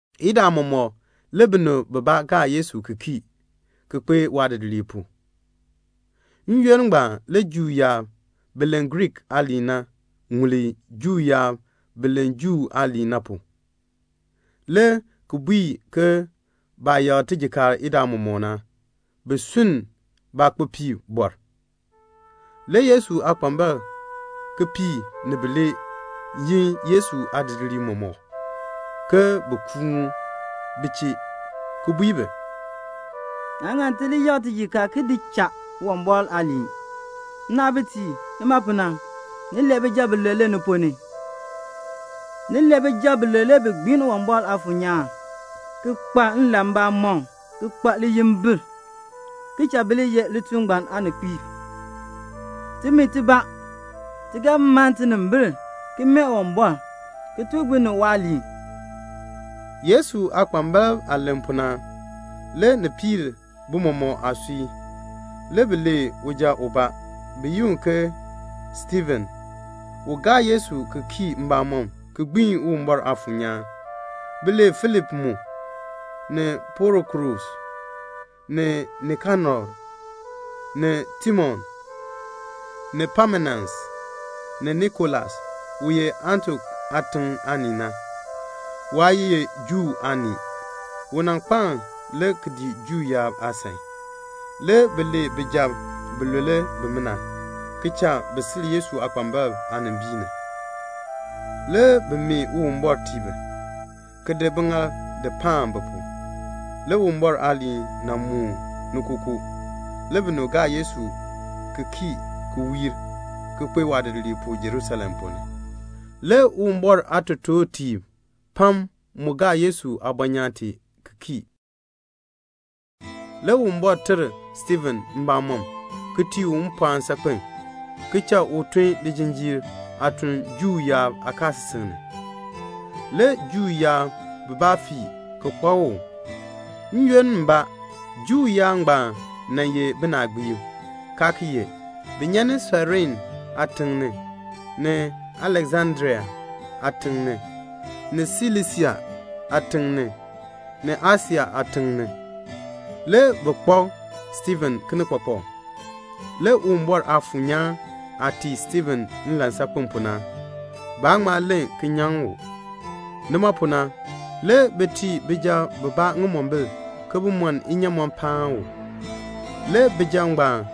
Idaa mɔmɔk le binib bibaa gaa Yesu ki kii ki kpee waadidiliib pu. N-yoonn ngbaan le Juu yaab bi len Griik aaliin na ŋuli Juu yaab bi len Juu aaliin na pu, le ki bui ke baah yakr tijikaar idaa mɔmɔk na, bi sunn baakpopiibɔr. Le Yesu aakpambalb kipiik ni bilee yin Yesu aadidiliib mɔmɔk, ke bin kuun bi chee, ki bui bi, "Naa ŋan ti li yakr tijikaar ki di cha Uwumbɔr aaliin. Nnaabitiib, nima pu na, ni lee bijab bilule ni ponn ni. Ni lee bijab bilule bi gbiin Uwumbɔr Aafuur nyaan, ki kpa nlan mbamɔm, ki kpa liyimbil, ki cha bi li ye lituln ngbaan aaninkpiib. Timi tibaa, ti ga mann tinimbil ki mee Uwumbɔr, ki tuk binib waaliin." Yesu aakpambalb aah len pu na, le ni piir bi mɔmɔk aasui. Le bi lee uja ubaa, bi yi u ke Stiifen, u gaa Yesu ki kii mbamɔm ki gbiin Uwumbɔr Aafuur nyaan. Bi lee Filip mu, ni Prokorus, ni Nikanor, ni Timon, ni Pamenas, ni Nikolas, u ye Antiok aatiŋ aanii na. Waa ye Juu aanii. U nan kpaln le ki dii Juu yaab aasan. Le bi lee bijab bilule bimina, ki cha bi sil Yesu aakpambalb aanimbiin ni. Le bi mee Uwumbɔr tii bi, ki di biŋaal ki di paan bi pu. Le Uwumbɔr aaliin nan mooni ni kookoo. Le binib gaa Yesu ki kii ki wiir, ki kpae waadidiliib pu Jerusalem ponn ni. Le Uwumbɔr aatotoortiib pam mu gaa Yesu aabɔnyaan tee ki kii. Le Uwumbɔr ter Stiifen mbamɔm, ki tii u mpɔɔn saakpen, ki cha u tun lijinjiir aatun Juu yaab aakaasisik ni. Le Juu yaab bibaa fii ki kpak u. N-yoonn mbaa, Juu yaab ngbaan nan ye binaagbiib, kaa ki ye. Bi nyan ni Sairene aatiŋ ni, ni Aleksandria aatiŋ ni, ni Silisia aatiŋ ni, ni Asia aatiŋ ni. Le bi kpak Stiifen kinikpakpak. Le Uwumbɔr Aafuur nyaan aah tii Stiifen nlan saakpen pu na, baa ŋma len ki nyaŋ u. Nima pu na le bi tii bijab bibaa ŋimombil ke bin mɔn inyaamɔn paan u. Le bijab ngbaan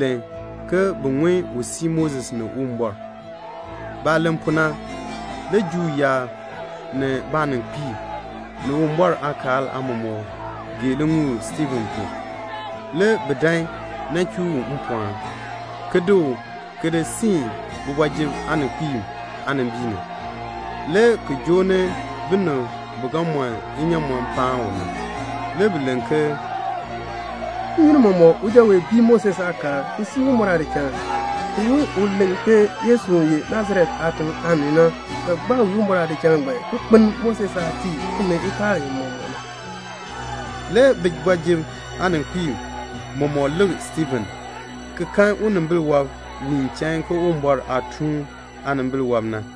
len ke bi ŋun u sii Moses ni Uwumbɔr. Baah len pu na, le Juu yaab ni baaninkpiib, ni Uwumbɔr aakaal aamɔmɔkb gee liŋuul Stiifen pu. Le bi dan nan chuu u mpɔɔn, ki di u ki di siin kooti ni aaninkpiib aanimbiin ni, le ki joo ni binib bi ga mɔn inyaamɔn paan u. Le bi len ke "N-yoonn mɔmɔk uja wee bii Moses aakaal, ki sii Uwumbɔr aadichal. Ti ŋun u len ke Yesu, u ye Nasaret aatiŋ aanii na, ga gbaa wii Uwumbɔr aadichal ngbaan, ki kpeln Moses aah nan tii timi nkaal mɔmɔk na." Le kooti ni aaninkpiib mɔmɔk lik Stiifen ki kan unimbil wɔb wiin chain ke Uwumbɔr aatuun aanimbil wɔb na.